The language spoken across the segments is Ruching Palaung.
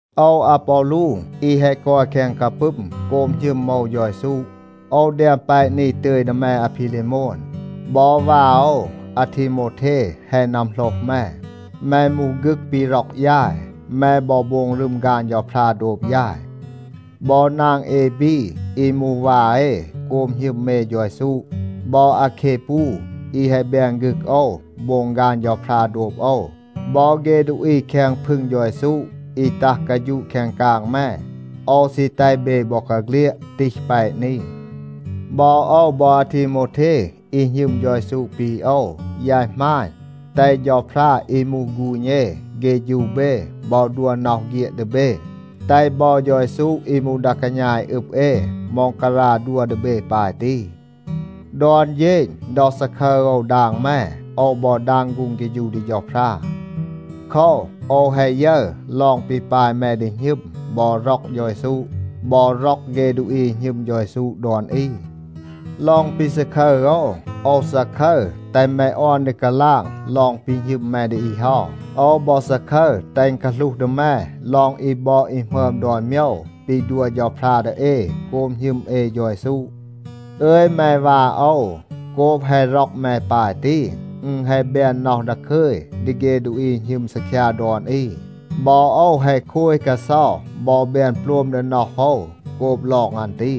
โอว อาปอลู อี แฮะ กอย แคง กาปึม โกบ หณึม โอว เฌา เยซู, โอว แดม แปะ นี ตึย ดี แม อาพีเลโมน. บอ วา โอว อาทีโมวเท แฮะ นัมโหลห แม. แม มูห ฆึก ปี ร็อก ยาย. แม บอ โบง รึม ฆาน เฌาพรา โดบ ยาย. บอ นาง เอบี อี มูห วา เอ โกบ หณึม เอ เฌา เยซู, บอ อาแคปู อี แฮะ แบน ฆึก โอว โบง ฆาน เฌาพรา โดบ โอว, บอ เฆ ดูอี แคง พึง เฌา เยซู อี ตัห กาฌูะ แคง กาง แม, โอว ซี แตห เบ บอกาเฆลียด ตีห แปะ นี. บอ โอว บอ อาทีโมวเท อี หณึม เฌา เยซู ปี โอว, ยาย หมาณ, แตห เฌาพรา อี มูห ฆูณ เอ เฆฌู เบ บอ ดัว น็อห เฆียด ดี เบ, แตห บอ เฌา เยซู อี มูห ดา กาณา อี อึบ เอ ม็องการา ดัว ดี เบ ปาย ตี. ดอน เฌณ ดอ ซาคึร โอว ดาง แม, โอว บอ ดาง ฆูง เฆฌู ดี เฌาพรา. โคว, โอว แฮะ ยึร ลอง ปี ปาย แม ดี หณึม บอ ร็อก เฌา เยซู, บอ ร็อก เฆ ดูอี อี หณึม เฌา เยซู ดอน อี. ลอง ปี ซาคึร โอว, โอว ซาคึร แตห แม ออน ดี กาลาง ลอง ปี หณึม แม ดี อี เฮา. โอว บอ ซาคึร แตห อึณ กาหลูห ดี แม ลอง อี บอด อี หมึอม ดอน โมยว ปี ดัว เฌาพรา ดี เอ โกบ หณึม เอ เฌา เยซู. อึย แม วา โอว, โกบ แฮะ ร็อก แม ปาย ตี, อึณ แฮะ แบน น็อห ดาคึย ดี เฆ ดูอี อี หณึม ซีคยา ดอน อี. บอ โอว แฮะ โคย กาเซา บอ แบน โปลม ดี น็อห โอว โกบ ลอง อัน ตี.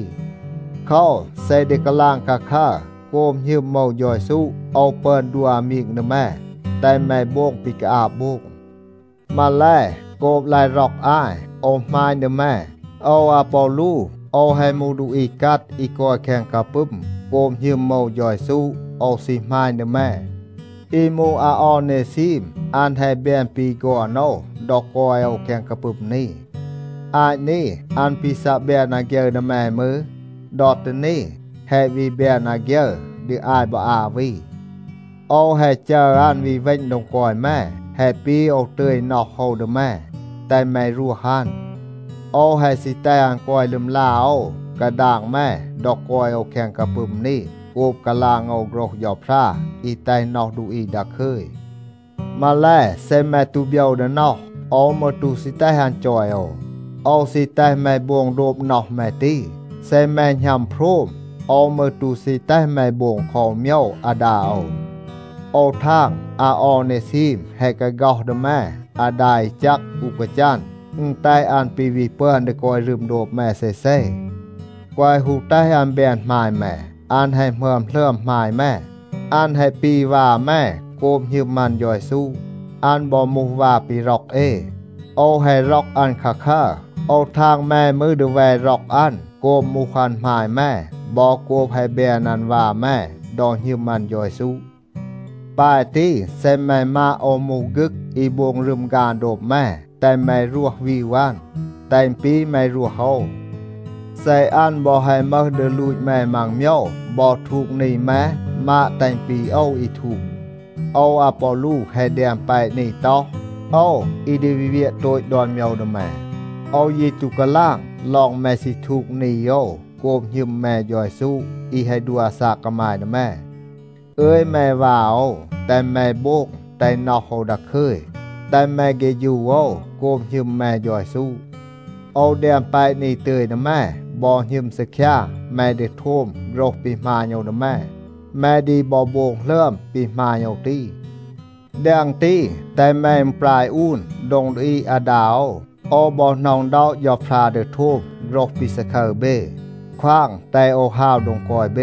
โคว, เซ ดี กาลาง คาคัร, โกบ หณึม โอว เฌา เยซู โอว ปึอน ดัว อามีง ดี แม, แตห แม โบง ปี กาอาบ โบง. มาแล, โกบ ลาย ร็อก อาย, โอว หมาณ ดี แม. โอว อาปอลู, โอว แฮะ มูห ดูอี กัด อี กอย แคง กาปึม โกบ หณึม โอว เฌา เยซู. โอว ซี หมาณ ดี แม. อี มูห อาออเนซีม, อัน แฮะ แบน ปี ฆอน โอว ดอ กอย โอว แคง กาปึม นี. อาต นี, อัน ปี ซัะ แบน อาฆยึร ดี แม มืร, ดอ ตี นี, แฮะ วี แบน อาฆยึร ดี อาย บอ อา วี. โอว แฮะ จัร อัน วี เวณ โดง กอย แม. แฮะ ปี โอว ตึย น็อห โอว ดี แม. แตห แม รวห อัน. โอว แฮะ ซี แตห อัน กอย ลึมลา โอว กาดาง แม ดอ กอย โอว แคง กาปึม นี โกบ กาลาง โอว โฆรห เฌาพรา อี แตห น็อห ดูอี ดาคึย. มาแล, เซ แม ตู โบยว ดี น็อห, โอว มืร ตู ซี แตห อัน จอย โอว. โอว ซี แตห แม โบง โดบ น็อห แม ตี. เซ แม หณัม โพรม, โอว มืร ตู ซี แตห แม โบง คอ อู โมยว อาดา โอว. โอว ทาง อาออเนซีม แฮะ กาฆ็อห ดี แม อาดา อี แจก อู กาจัน, อึณ แตห อัน ปี วี ปึอน ดี กอย รึม โดบ แม เซเซ. แกวะ ฮู แตห อัน แบน หมาย แม. อัน แฮะ หมึอม หลึอม หมาย แม. อัน แฮะ ปี วา แม โกบ หณึม อัน เฌา เยซู. อัน บอ มูห วา ปี ร็อก เอ. โอว แฮะ ร็อก อัน คาคัร. โอว ทาง แม มืร ดี แว ร็อก อัน โกบ มูห อัน หมาย แม, บอ โกบ แฮะ แบน อัน วา แม ดอ หณึม อัน เฌา เยซู. ปาย ตี, เซ แม มาด โอว มูห ฆึก อี โบง รึม ฆาน โดบ แม, แตห แม รวห วีว อัน. แตห อึณ ปี แม รวห โอว. เซ อัน บอ แฮะ มึห ดี ลูต แม มัง โมยว บอ ทูก นี แม, มาด แตห อึณ ปี โอว อี ทูก. โอว อาปอลู แฮะ แดม แปะ นี ต็อห, โอว อี ดี วี เวียะ โตต ดอน โมยว ดี แม. โอว ยี ตู กาลาง ลอง แม ซี ทูก นี โอว โกบ หณึม แม เฌา เยซู อี แฮะ ดัว อาซาก กามาย ดี แม. อึย แม วา โอว, แตห แม โบง แตห น็อห โอว ดาคึย, แตห แม เฆฌู โอว โกบ หณึม แม เฌา เยซู. โอว แดม แปะ นี ตึย ดี แม, บอ หณึม ซีคยา แม ดี โทม โฆรห ปี หมาณ โอว ดี แม. แม ดี บอ โบง หลึอม ปี หมาณ โอว ตี. แดง ตี, แตห แม อึณปราย อูน โดง ดี อีด อาดา โอว. โอว บอ หน็อะ อึณด็อะ เฌาพรา ดี โทม โฆรห ปี ซาคึร เบ, ควาง แตห โอว ฮาว โดง กอย เบ.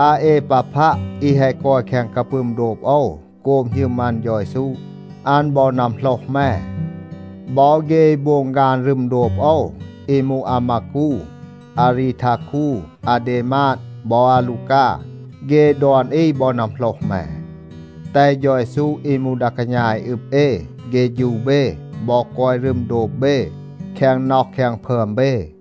อาเอปาพัะ อี แฮะ กอย แคง กาปึม โดบ โอว โกบ หณึม อัน เฌา เยซู, อัน บอ นัมโหลห แม. บอ เฆ อี โบง ฆาน รึม โดบ โอว, อี มูห อามากู, อารีทาคู, อาเดมาด, บอ อาลูกา, เฆ ดอน อี บอ นัมโหลห แม. แตห เฌา เยซู อี มูห ดา กาณา อี อึบ เอ เฆฌู เบ บอ กอย รึม โดบ เบ แคง น็อห แคง พึอม เบ.